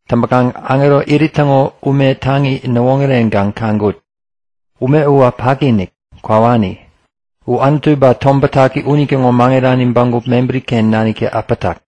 Täŋpäkaŋ aŋerotä irit täŋo ume taŋi näwoŋärewän kaŋkut. Ume uwä paki-inik, kwawani. U Anutu ba Tom Bätaki unitäŋo maŋirani bägup mebäri-ken naniktä äpätak.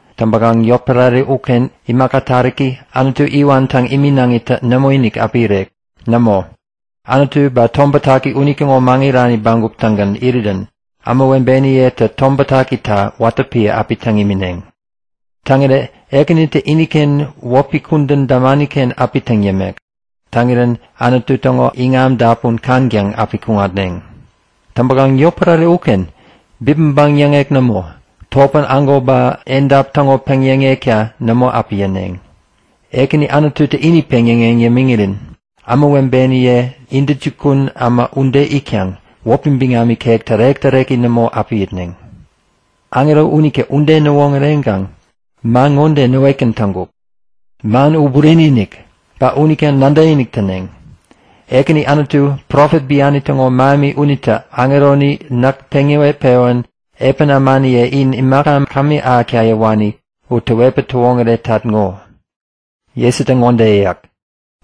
Täŋpäkaŋ yotpärare uken imaka taräki, Anutu iwan täŋ iminaŋitä nämoinik api irek. Nämo, Anutu ba Tom Bätaki unitäŋo maŋirani bägup-tägän irirän ämawebeniyetä Tom Bätakita watä piä api täŋ imineŋ. Täŋirä Ekänitä iniken wäpi kudän damani-ken api täŋ yämek. Täŋirän Anutu täŋo iŋam dapun kaŋtäŋ api kuŋatneŋ. Täŋpäkaŋ yotpärare uken bipmäŋpäŋ yäŋek nämo, topän ägo ba edap täŋo peŋyäŋekta nämo api yäneŋ. Ekäni Anututä ini peŋyäŋeŋ yämiŋirän ämawebeniye intäjukun äma ude itkaŋ wäpi biŋam ikek tärek-täreki nämo api itneŋ. Aŋero unitä ude näwoŋäreŋkaŋ man ŋode näwetgän täŋkuk; Man u bureni-inik! Ba unita nadäkinik täneŋ. Ekäni Anutu, profet biani täŋo mähemi unitä aŋeroni näk peŋ näwet-pewän epän ämaniye in imaka kämi ahäkta yäwani u täwetpäŋ täwoŋäretat ŋo. Jesutä ŋode yäyak;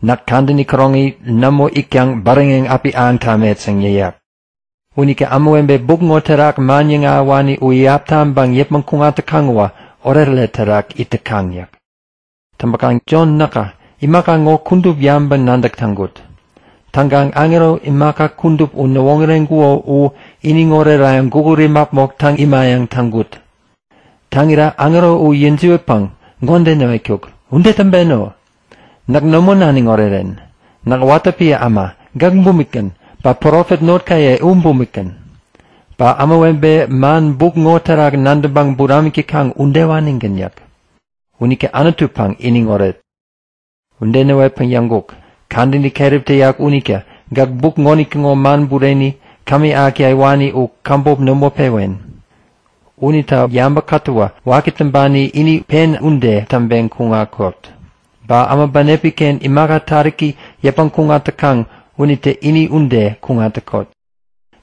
Näk kadäni käroŋi nämo itkaŋ bäräŋeŋ api ahäŋ tamet yäŋ yäyak. Unita ämawebe buk ŋo terak man yäŋahäwani u iyap taŋpäŋ yäpmäŋ kuŋat täkaŋ uwä oretoret terak it täkaŋ yäk. Täŋpäkaŋ Jon näkä imaka ŋo kudup yabäŋpäŋ-nadäk täŋkut. Täŋkaŋ aŋero imaka kudup u näwoŋäreŋkuko u iniŋ orerayäŋ gukut imäpmok täŋ imayäŋ täŋkut. Täŋira aŋero u yäjiwätpäŋ ŋode näwetkuk; Ude täŋpeno! Näk nämo naniŋ oreren! Näk piä watä äma, gäk bumikgän, ba poropet notkaye u bumikgän. Ba ämawebe man buk ŋo terak nadäŋpäŋ buramik täkaŋ udewanigän yäk. Unita Anutupäŋ iniŋoret! Ude näwetpäŋ yäŋkuk; Kadäni keräp täyak unita gäk buk ŋonitäŋo man bureni, kämi ahäkta yäwani u käbop nämo pewen. Unita yabä kätäwä waki täŋpani ini pen ude täŋpeŋ kuŋatkot. Ba äma bänepi-ken imaka taräki yäpmäŋ kuŋat täkaŋ unitä ini ude kuŋat täkot.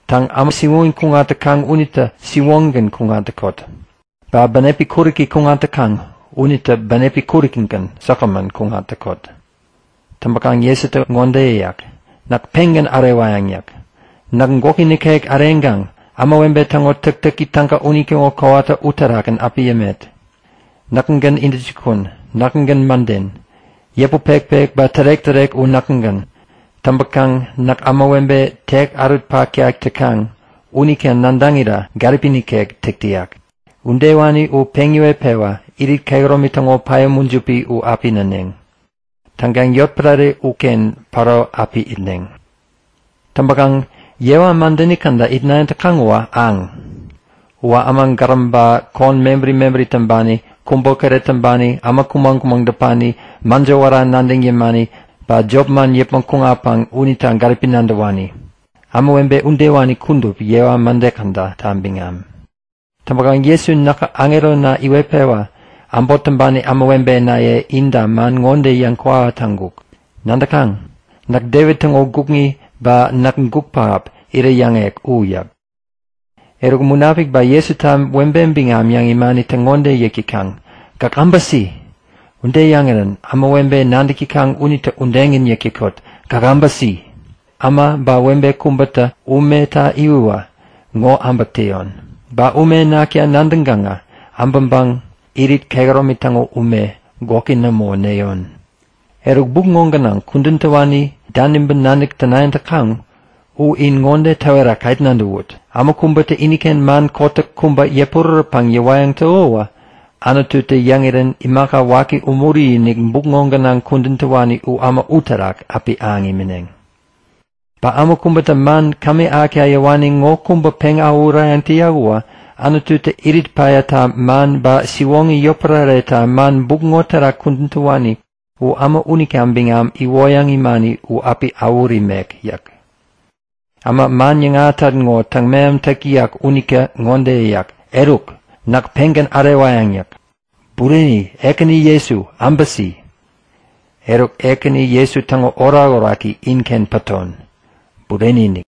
Täŋ, äma siwoŋi kuŋat täkaŋ unitä siwoŋigän kuŋat täkot. Ba bänepi kuräki kuŋat täkaŋ unitä bänepi kuräkigän säkgämän kuŋat täkot. Täŋpäkaŋ Jesutä ŋode yäyak; Näk pengän ärewayäŋ yäk. Näk gwäki nikek äreŋkaŋ ämawebe täŋo täktäki täga unitäŋo kowata uterakgän api yämet. Näkägän intäjukun, näkägän mäden. Yäput pekpek ba tärek-tärek u näkägän. Täŋpäkaŋ näk ämawebe teki ärut-paktak täkaŋ unita nadäŋira gäripi nikek täk täyak. Udewani u peŋ yäwetpewa irit kehäromi täŋo päya mujipi u api näneŋ. Täŋkaŋ yotpärare uken päro api itneŋ. Täŋpäkaŋ yewa mädeni käda itnayäŋ täkaŋ uwä aŋ. Uwä äma gäräm ba kon mebäri mebäri täŋpani, kubokäret täŋpani, äma kumäŋ-kumäŋ däpani, mäjo wära nadäŋ yämani, ba jopman yäpmäŋ kuŋatpäŋ unita gäripi nadäwani. Ämawebe udewani kudup yewa mäde kädata biŋam. Täŋpäkaŋ Jesu näkä aŋerona iwetpewa äbot täŋpani ämawebenaye inta man ŋo yäŋkwawa taŋkuk. Nadäkaŋ? Näk Devit täŋo gukŋi ba näk guk pähap, iräyäŋek u yäk. Eruk, Munapik ba Jesuta webe biŋam yäŋ imanitä ŋode yäk täkaŋ; Gäk äbäsi! Ude yäŋirän ämawebe nadäk täkaŋ unitä udegän yäk täkot; Gäk äbäsi! Äma ba webe kubätä umeta iwäwä ŋo äbäk täyon. Ba ume nakta nadäŋkaŋä äbäŋpäŋ irit kehäromi täŋo ume, gwäki nämo näyon. Eruk, buk ŋo gänaŋ kudän täwani daniŋpäŋ nadäk tänayäŋ täkaŋ u in ŋode täwera ket nadäwut! Äma kubätä iniken man kotäk kubä yäpurärätpäŋ yäwayäŋ täko uwä Anututä yäŋirän imaka waki umuri-inik buk ŋo gänaŋ kudän täwani u äma uterak api ahäŋ imineŋ. Ba äma kubätä man kämi ahäkta yäwani ŋo kubä peŋ awähurayäŋ täyak uwä Anututä irit päyata man ba siwoŋi yotpärareta man buk ŋo terak kudän täwani u äma unita biŋam iwoyäŋ imani u api awähut imek yäk. Äma, man yäŋahätat ŋo täŋ-mehamtäk täyak unitä ŋode yäyak; Eruk! Näk pengän ärewayäŋ yäk. Bureni! Ekäni Jesu, äbäsi! Eruk, Ekäni Jesu täŋo orakoraki inken paton. Bureni-inik!